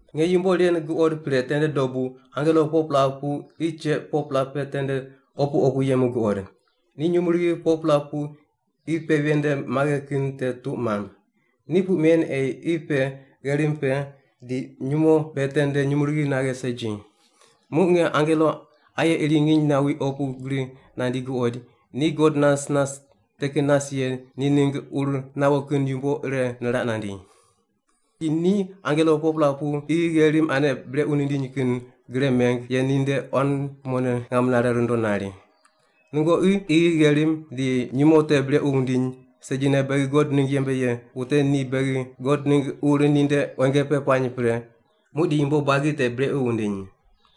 Nge yumbo ren guqod pre tende dobu angelo 4-pela pu qi cheq 4-pela pe tende opu opu yemu guqod. Ni nyumurighi 4-pela pu qi pe ven nde maghe kin te tuq mamb. Ni puq men ei qi pe, gherim pe, di nyumo pe tende nyumurighi naghe segi. Muq nge angelo aye iri nginy nawi opu gri nandi guqoid, ni God nas nas te kin nas ye ni ningg ur nawo kin yumbo ire niraq nandi. Di ni angelo 4-pela pu qi gherim ane brequ mindiny kin gre mem ye ninde quan kumone ngam nare rundo nari, “Nungoqi qi, gherim di nyumo te brequ wundiny segine beghi God ningg yembe ye wute ni beghi God ningg ur ninde quenge pe puany pre, muqdi yumbo buagi te brequ wundiny.”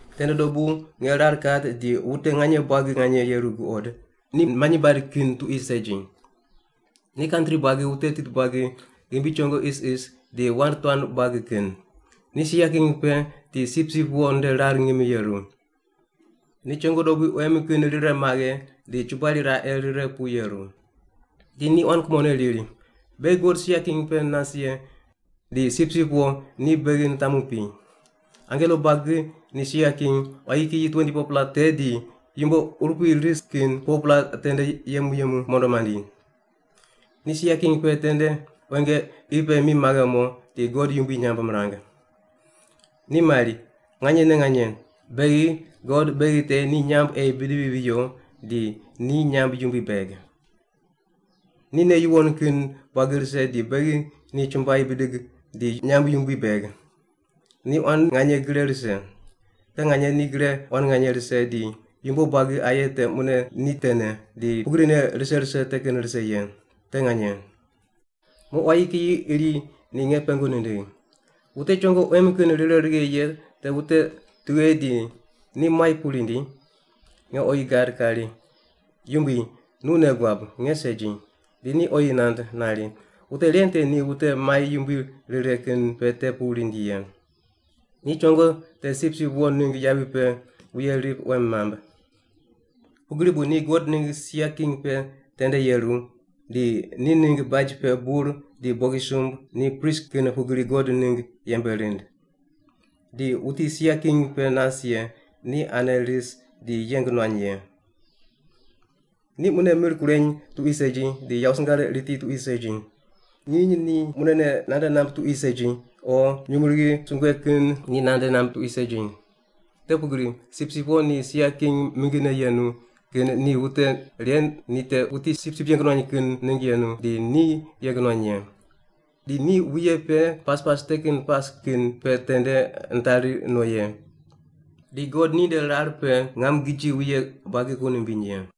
Tende dobu nge rar kat di wute nganye buagi nganye yeru guqod, ni manyi bad kin tuqui segi. Ni kantri buagi, wute tit buagi, ghimbi chongo isis, di wand tuan buagi kin. Ni sia king pe di Sipsip Wo nde rar ngimine yeru. Ni chongo dobui quem kin rire maghe di chubair raqe rire pu yeru. Di ni quan kumone riri, “Beghi God sia king pe nas ye di Sipsip Wo ni beghi mitamu pi.” Angelo buagi ni sia king, quayi kiyi 24-pela te di yumbo urupui ris kin 4-pela tende yemu yemu mondo mandi. Ni sia king pe tende quenge qi pe mi maghe mo di God yumbui nyamb mirang. Ni mari, “Nganyene nganye! Beghi, God beghi te ni nyamb ei bidivi viyo di ni nyamb yumbui beg. Ni nei yuwon kin buagi rise di beghi ni chumbuai bidig di nyamb yumbui beg! Ni quan nganye gre rise. Te nganye ni gre quan nganye rise di yumbo buagi aye te mune ni tene, di pugrine rise rise te kin rise ye. Te nganye!” Muq quayi kiyi iri ni nge pengu nindigh, “Wute chongo quem kin rire maghe ye te wute tughe di ni muai pu rindi?” Nge oyi gad kari, “Yumbui, nu nei guab, nge segi.” Di ni oyi nand nari, “Wute ren te ni wute mai yumbui rire kin pe te pu rindi ye. Ni chongo te Sipsip Wo ningg yavi pe wuye rip quem mamb. Pugri bu ni God ningg sia king pe tende yeru, di ni ningg baj pe bur di bogisumb ni prist kin pugri God ningg yembe rind. Di wuti sia king pe nas ye ni ane ris di yeng nuany ye. Ni mune mir kureny tuqui segi di yawo singar riti tuqui segi. Nginy ni munene nande namb tuqui segi o nyumurighi sungue kin ni nande namb tuqui segi. Te pugri Sipsip Wo ni sia king mingine yenu kin ni wute ren ni te wuti sipsip yeng nuany kin ningg yenu, di ni yeng nuany ye. Di ni wuye pe pas pas te kin pas kin pe tende nitari no ye. Di God ninde rar pe ngam giji wuye buagi ku nimbiny ye.”